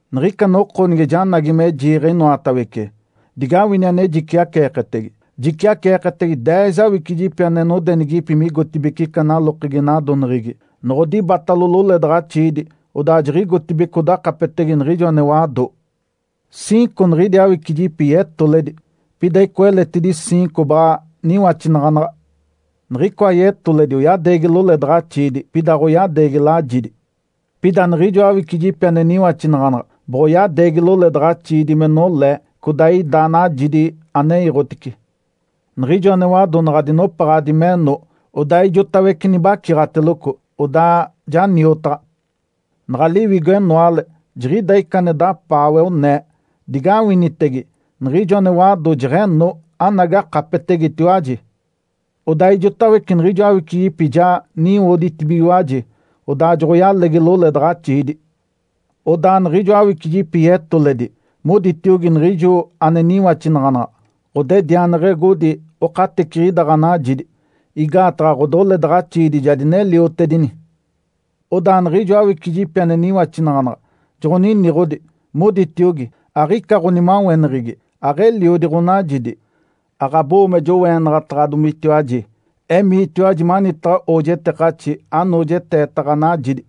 Niɡ̶ica noko nige janagi me jiiɡ̶e inoatawece, digawini ane jiciaceeketege. Jiciaceeketege deez awicijipi ane nodenigipi migotibeci ica lalokegi nadoneɡ̶egi, noɡ̶odibatalo loledaɡ̶axiidi, odaa jiɡ̶igotibeci odakapetege niɡ̶ijo ane wado. Ciinco niɡ̶idi awicijipi yetoledi, pida icoa eletidi ciinco baɡ̶a niwaxinaɡ̶anaɡ̶a. Niɡ̶icoa yetoledi oyadeegi loledaɡ̶axiidi, pida aɡ̶oyadeegi lajidi. Pida niɡ̶ijo awicijipi ane niwaxinaɡ̶anaɡ̶a boɡ̶oyadeegi loledaɡ̶axiidi me nolee codaa ida najidi ane iiɡ̶otice. Niɡ̶ijo ane wado naɡ̶a dinopaɡ̶adi meno, odaa ijotawece nibaciɡ̶ateloco, odaa ja niotaɡ̶a. Naɡ̶a liwigo-enoale jiɡ̶ida ica ane dapaawe, onee, ‘Digawinitege! Niɡ̶ijo ane wado jeɡ̶eno, anagi akapetetegetiwaji!’ Odaa ijotawece niɡ̶ijo awicijipi ja niwoditibigiwaji, odaa joɡ̶oyalegi loledaɡ̶axiidi. Odaa niɡ̶ijo awicijipi yetoledi moditiogi niɡ̶ijo ane niwaxinaɡ̶anaɡ̶a, ‘Ǥodedianeɡ̶egodi okateciɡ̶ida ɡ̶anajidi, igaataɡ̶a ɡ̶odoledaɡ̶axiidi ja dineliotedini.’ Odaa niɡ̶ijo awicijipi ane niwaxinaɡ̶anaɡ̶a joɡ̶oniniɡ̶odi, moditiogi, ‘Aɡ̶ica ɡ̶onimaweneɡ̶egi! Aɡ̶eliodi ɡ̶onajidi, aɡ̶abo-oo me joweenaɡ̶ataɡ̶adomitiwaji. Emiitiwaji manitaɡ̶a oojetekaxi, anoojeteeta ɡ̶anajidi!’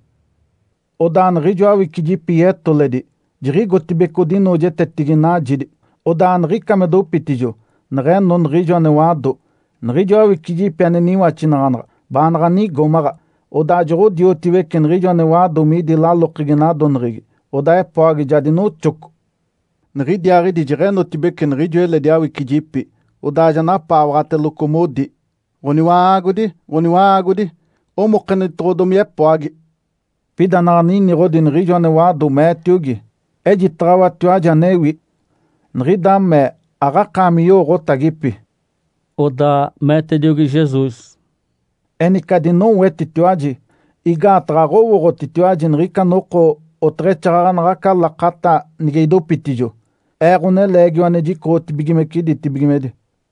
Odaa niɡ̶ijo awicijipi yetoledi jiɡ̶igotibeci odinoojetetigi najidi. Odaa aniɡ̶ica me dopitijo, neɡ̶eno niɡ̶ijo ane wado. Niɡ̶ijo awicijipi ane niwaxinaɡ̶anaɡ̶a baanaɡ̶a nigomaɡ̶a, odaa joɡ̶odiotiwece niɡ̶ijo ane wado midi lalokegi nadoneɡ̶egi. Odaa epoagi ja dinoxoco. Niɡ̶idiaaɡ̶idi jeɡ̶enotibeci niɡ̶ijo eledi awicijipi, odaa ja napaawaɡ̶ateloco, modi, ‘Ǥoniwa-aagodi! Ǥoniwa-aagodi! Omokenitoɡ̶odomi epoagi!’ Pida naɡ̶a niniɡ̶odi niɡ̶ijo ane wado, meetiogi, ‘Ejitaɡ̶awatiwaji anewi. Niɡ̶ida mee aɡ̶akaami yowooɡ̶otagipi.’” Odaa meetediogi Jesus, “Enice adinowetitiwaji! Igaataɡ̶a aɡ̶owooɡ̶otitiwaji niɡ̶ica noko oteɡ̶exaaɡ̶aɡ̶a naɡ̶aca lakata nige idopitijo Ee, Ǥoneleegiwa ane jicoɡ̶otibigimece ditibigimedi.”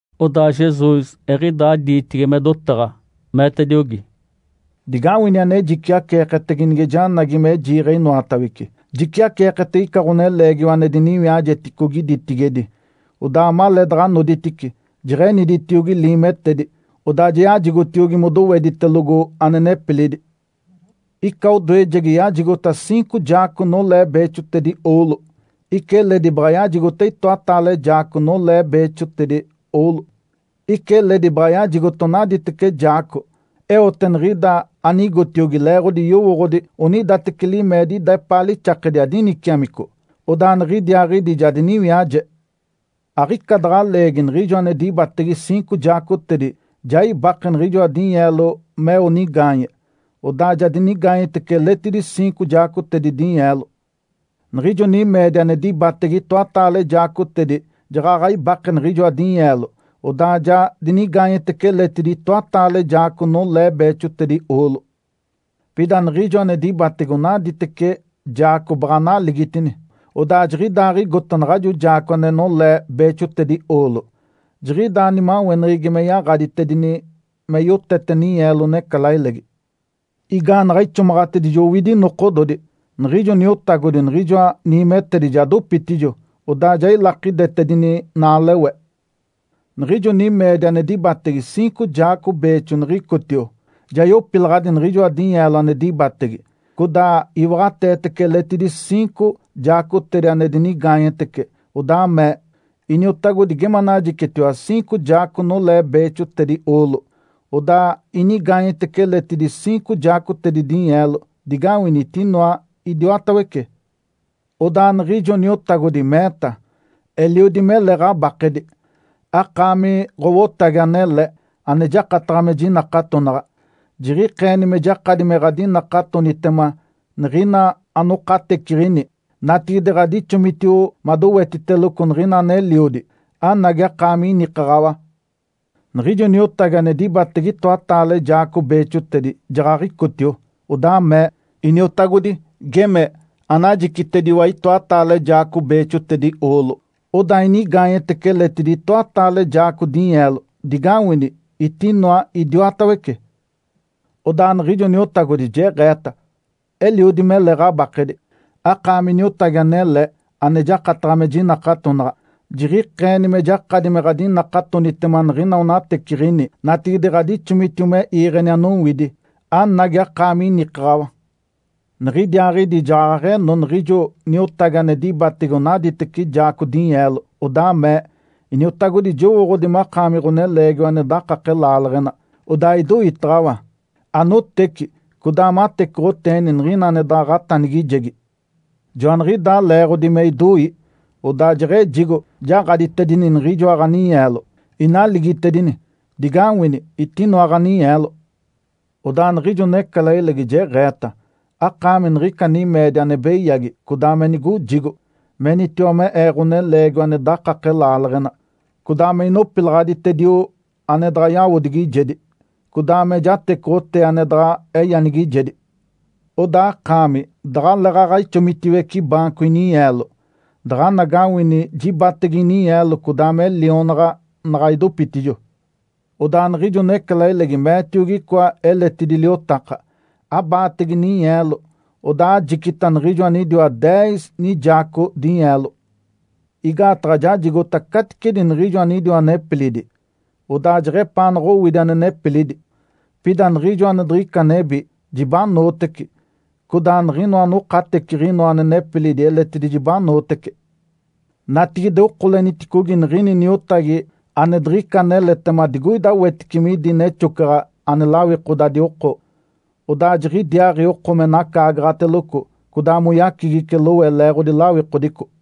Odaa Jesus eɡ̶idaa diitigi me dotaɡ̶a, meetediogi, “Digawini ane jiciaceeketege nige janagi me jiiɡ̶e inoatawece. Jiciaceeketege ica ɡ̶oneleegiwa ane diniwiajeticogi ditigedi. Odaa maleedaɡ̶a noditice, jeɡ̶eniditiogi liimetedi, odaa ja yajigotiogi modoweditelogo ane nepilidi. Ica odoejegi yajigota ciinco jaaco nolee beexotedi oolo, ica eledi baɡ̶a yajigota itoataale jaaco nolee beexotedi oolo, ica eledi baɡ̶a yajigota onadateci jaaco. Eote niɡ̶ida anigotiogi leeɡ̶odi yowooɡ̶odi onidateci limeedi ida epaa lixakedi adiniciamico. Odaa niɡ̶idiaaɡ̶idi ja diniwiaje. Aɡ̶ica daɡ̶a leegi niɡ̶ijo ane dibatege ciinco jaacotedi ja ibake niɡ̶ijoa dinyeelo meo nigaanye. Odaa ja dinigaanyetece eletidi ciinco jaacotedi dinyeelo. Niɡ̶ijo nimeedi ane dibatege itoataale jaacotedi jaɡ̶aɡ̶a ibake niɡ̶ijoa dinyeelo, odaa ja dinigaanyetece eletidi itoataale jaaco nolee beexotedi oolo. Pida niɡ̶ijo ane dibatege onadateci jaaco baɡ̶a naligitini, odaa jiɡ̶idaaɡ̶igota naɡ̶ajo jaaco ane nolee beexotedi oolo, jiɡ̶idaa nimaweneɡ̶egi me yaɡ̶aditedini me yotete ninyeelo necalailegi. Igaanaɡ̶a ixomaɡ̶atedijo owidi nokododi, niɡ̶ijo niotagodi niɡ̶ijoa niimetedi ja dopitijo, odaa ja ilakidetedini naalewe. Niɡ̶ijo nimeedi ane dibatege ciinco jaaco beexo niɡ̶icotio, ja yopilaɡ̶adi niɡ̶ijoa dinyeelo ane dibatege, codaa iwaɡ̶ateetece eletidi ciinco jaacotedi ane dinigaanyetece. Odaa mee, ‘Iniotagodi, geme anajicitediwa ciinco jaaco nolee beexotedi oolo. Odaa inigaanyetece eletidi ciinco jaacotedi dinyeelo. Digawini, etinoa idiwatawece!’ Odaa niɡ̶ijo niotagodi meeta, ‘Eliodi mele ɡ̶abakedi! Akaami ɡ̶owotagi anele ane jakataɡ̶a me jinakatonaɡ̶a. Jiɡ̶ikeeni me jakadi me ɡ̶adinakatonitema niɡ̶ina anokateciɡ̶ini. Natigide ɡ̶adixomitio madowetiteloco niɡ̶ina aneliodi. Anagi, akaami inikaɡ̶awa!’ Niɡ̶ijo niotagi ane dibatege itoataale jaaco beexotedi jaɡ̶aɡ̶icotio, odaa mee, ‘Iniotagodi, geme anajicitediwa itoataale jaaco beexotedi oolo, odaa inigaanyetece eletidi itoataale jaaco dinyeelo. Digawini, etinoa idiwatawece!’ Odaa niɡ̶ijo niotagodi jeɡ̶eeta, ‘Eliodi mele ɡ̶abakedi! Akaami niotagi anele ane jakataɡ̶a me jinakatonaɡ̶a. Jiɡ̶ikeeni me jakadi me ɡ̶adinakatonitema niɡ̶ina anokateciɡ̶ini. Natigide ɡ̶adixomitio me iiɡ̶eni anowidi. Anagi, akaami inikaɡ̶awa!’ Niɡ̶idiaaɡ̶idi jaɡ̶aɡ̶eno niɡ̶ijo niotagi ane dibatege onadateci jaaco dinyeelo, odaa mee, ‘Iniotagodi, jowooɡ̶odi makaami ɡ̶oneleegiwa ane dakake laaleɡ̶ena, odaa idoitaɡ̶awa. Anoteci codaa matecoɡ̶oteeni niɡ̶ina ane daɡ̶a ɡ̶atanigijegi. Joaniɡ̶idaa leeɡ̶odi me idoi, odaa jeɡ̶ejigo, jaɡ̶aditedini niɡ̶ijoa ɡ̶aninyeelo, inaligitedini. Digawini, etinoa ɡ̶aninyeelo!’ Odaa niɡ̶ijo necalailegi jeɡ̶eeta, ‘Akaami niɡ̶ica nimeedi ane beyagi codaa me nigojigo! Menitiwa me ee ɡ̶oneleegiwa ane dakake laaleɡ̶ena, codaa me inopilaɡ̶aditedio ane daɡ̶a yawodigijedi, codaa me jatecoɡ̶otee ane daɡ̶a eyanigijedi. Odaa akaami daɡ̶aleeɡ̶aɡ̶a ixomitiwece baanco ininyeelo, daɡ̶anagawini jibatege ininyeelo codaa me lionaɡ̶a naɡ̶a idopitijo.’ Odaa niɡ̶ijo necalailegi meetiogi icoa eletidi liotaka, ‘Abaatege ninyeelo, odaa ajicita niɡ̶ijo anidiwa deez nijaaco dinyeelo! Igaataɡ̶a jajigota caticedi niɡ̶ijo anidiwa nepilidi, odaa jeɡ̶epaanaɡ̶a owidi ane nepilidi. Pida niɡ̶ijo ane diɡ̶ica nebi, jibanootece, codaa niɡ̶inoa anokateciɡ̶inoa ane nepilidi eletidi jibanootece. Natigide okoleniticogi niɡ̶ini niotagi ane diɡ̶ica aneletema digoida wetice midi nexocaɡ̶a ane lawikodadi oko. Odaa jiɡ̶idiaaɡ̶i oko me nacaagaɡ̶ateloco codaa moyacigice lowe leeɡ̶odi lawikodico.’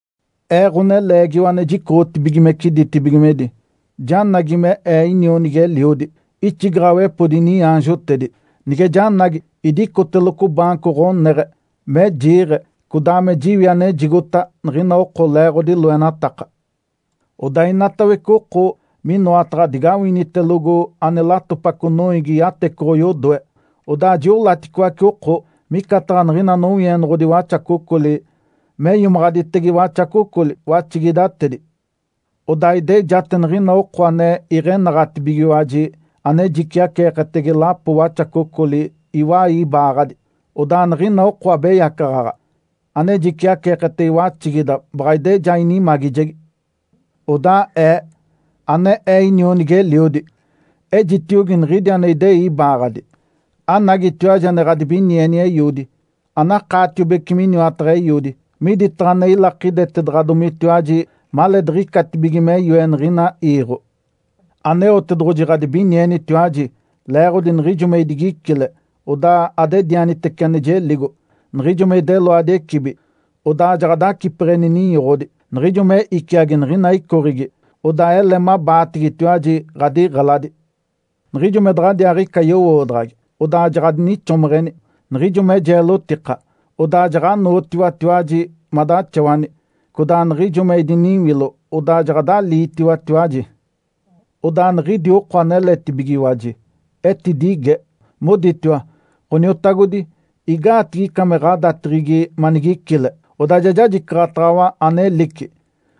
Ee, Ǥoneleegiwa ane jicoɡ̶otibigimece ditibigimedi, janagi me Ee inionigi-eliodi, ixigaɡ̶awepodi iniaanjotedi. Nige janagi, idicoteloco baanco ɡ̶oneɡ̶e me jiiɡ̶e codaa me jiwi anejigota niɡ̶ina oko leeɡ̶odi loenataka. Odaa inatawece oko minoataɡ̶a digawinitelogo ane latopaco noiigi yatecoɡ̶o yodoe. Odaa jiolaticoace oko micataɡ̶a niɡ̶ina nowienoɡ̶odi waxacocoli me iomaɡ̶aditege waxacocoli, waxigidatedi. Odaa idejate niɡ̶ina oko ane iɡ̶enaɡ̶atibigiwaji ane jiciaceeketege lapo waxacocoli iwai ibaaɡ̶adi, odaa niɡ̶ina oko abeyacaɡ̶aɡ̶a ane jiciaceeketege waxigida baɡ̶a ideja inimagijegi. Odaa Ee, ane Ee inionigi-eliodi, ejitiogi niɡ̶idi ane idei ibaaɡ̶adi, ‘Anagitiwaji ane ɡ̶adibinieni Eiodi! Anakaatiobece miniwataɡ̶a Eiodi, miditaɡ̶a ane ilakidetedaɡ̶adomitiwaji maleediɡ̶icatibige me yoe niɡ̶ina iiɡ̶o. Aneotedoɡ̶oji ɡ̶adibinienitetiwaji leeɡ̶odi niɡ̶ijo me idigicile, odaa adedianitece ane jeligo. Niɡ̶ijo me ideloadi ecibi, odaa ja adacipeɡ̶eni ninyoɡ̶odi. Niɡ̶ijo me iciagi niɡ̶ina icoɡ̶egi, odaa ele mabaatigitiwaji ɡ̶adiɡ̶eladi. Niɡ̶ijo me daɡ̶adiaaɡ̶ica yowoodaɡ̶agi, odaa jaɡ̶adinixomeɡ̶eni. Niɡ̶ijo me jeelotika, odaa jaɡ̶anootiwatiwaji madaxawani. Codaa niɡ̶ijo me idiniwilo, odaa jaɡ̶adaliitiwatiwaji.’ Odaa niɡ̶idi oko aneletibigiwaji etidige, moditiwa, ‘Ǥoniotagodi, igaatigi ica me ɡ̶adateɡ̶egi manigicile, odaa ja jajicaɡ̶ataɡ̶awa anelici,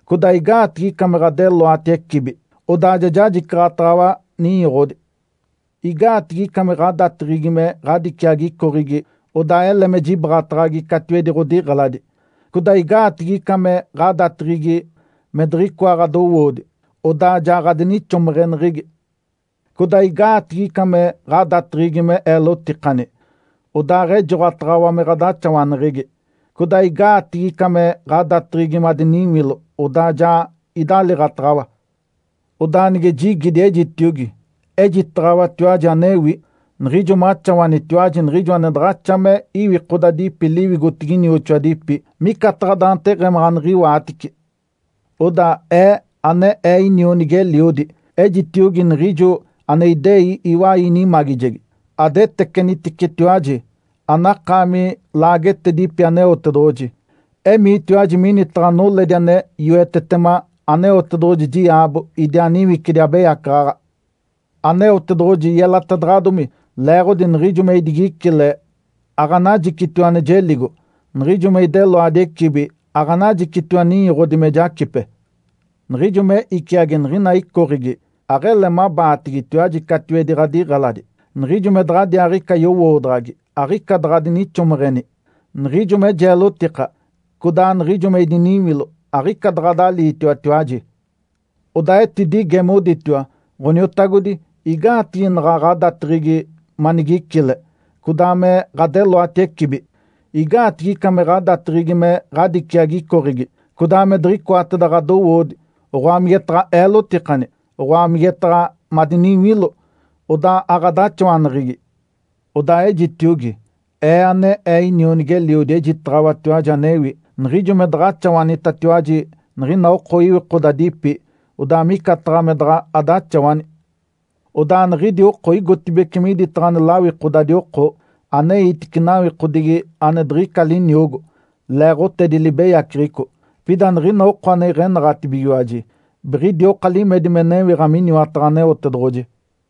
codaa igaatigi ica me ɡ̶adeloati ecibi, odaa ja jajicaɡ̶ataɡ̶awa ninyoɡ̶odi? Igaatigi ica me ɡ̶adateɡ̶egi me ɡ̶adiciagi icoɡ̶egi, odaa ele me jibaɡ̶ataɡ̶agi catiwedi ɡ̶odiɡ̶eladi? Codaa igaatigi ica me ɡ̶adateɡ̶egi me diɡ̶icoa ɡ̶adowoodi, odaa ja ɡ̶adinixomeɡ̶eneɡ̶egi? Codaa igaatigi ica me ɡ̶adateɡ̶egi me eelotikani, odaaɡ̶ejoɡ̶otaɡ̶awa me ɡ̶adaxawaneɡ̶egi? Codaa igaatigi ica me ɡ̶adateɡ̶egi madiniwilo, odaa ja idaliiɡ̶ataɡ̶awa?’ Odaa nige jigidi, ejitiogi, ‘Ejitaɡ̶awatiwaji anewi. Niɡ̶ijo maxawanitiwaji niɡ̶ijo ane daɡ̶axa me iwikodadipi liwigotigi inioxoadipi, micataɡ̶a daanteɡ̶emaɡ̶a aniɡ̶iwaatici.’ Odaa Ee, ane Ee inionigi-eliodi, ejitiogi niɡ̶ijo ane idei iwai inimagijegi, ‘Adeteceniticetiwaji, anakaami laagetedipi Aneotedoɡ̶oji! Emiitiwaji minitaɡ̶a noledi ane yoetetema Aneotedoɡ̶oji diaabo idiaa niwicidi abeyacaɡ̶aɡ̶a! Aneotedoɡ̶oji yelatedaɡ̶adomi leeɡ̶odi niɡ̶ijo me idigicile, aɡ̶anajicitiwa ane jeligo. Niɡ̶ijo me ideloadi ecibi, aɡ̶anajicitiwa ninyoɡ̶odi me jacipe. Niɡ̶ijo me iciagi niɡ̶ina icoɡ̶egi, aɡ̶ele mabaatigitiwaji catiwedi ɡ̶adiɡ̶eladi. Niɡ̶ijo me daɡ̶adiaaɡ̶ica yowoodaɡ̶agi, aɡ̶ica daɡ̶a adinixomeɡ̶eni. Niɡ̶ijo me jeelotika codaa niɡ̶ijo me idiniwilo, aɡ̶ica daɡ̶adaliitiwatiwaji.’ Odaa etidige, moditiwa, ‘Ǥoniotagodi, igaatigi naɡ̶a ɡ̶adateɡ̶egi manigicile, codaa me ɡ̶adeloati ecibi? Igaatigi ica me ɡ̶adateɡ̶egi me ɡ̶adiciagi icoɡ̶egi, codaa me diɡ̶icoateda ɡ̶adowoodi, oɡ̶oa migetaɡ̶a eelotikani, oɡ̶oa migetaɡ̶a madiniwilo, odaa aɡ̶adaxawaneɡ̶egi?’ Odaa ejitiogi, Ee, ane Ee inionigi-eliodi, ‘Ejitaɡ̶awatiwaji anewi. Niɡ̶ijo me daɡ̶a axawanitatiwaji niɡ̶ina oko iwikodadipi, odaa micataɡ̶a me daɡ̶a adaxawani.’ Odaa niɡ̶idi oko igotibeci miditaɡ̶a ane lawikodadi oko, aneitice nawikodigi ane diɡ̶ica liniogo, leeɡ̶otedi libeyaceɡ̶eco. Pida niɡ̶ina oko ane iɡ̶enaɡ̶atibigiwaji biɡ̶idioka limedi me newiɡ̶a miniwataɡ̶a Aneotedoɡ̶oji.”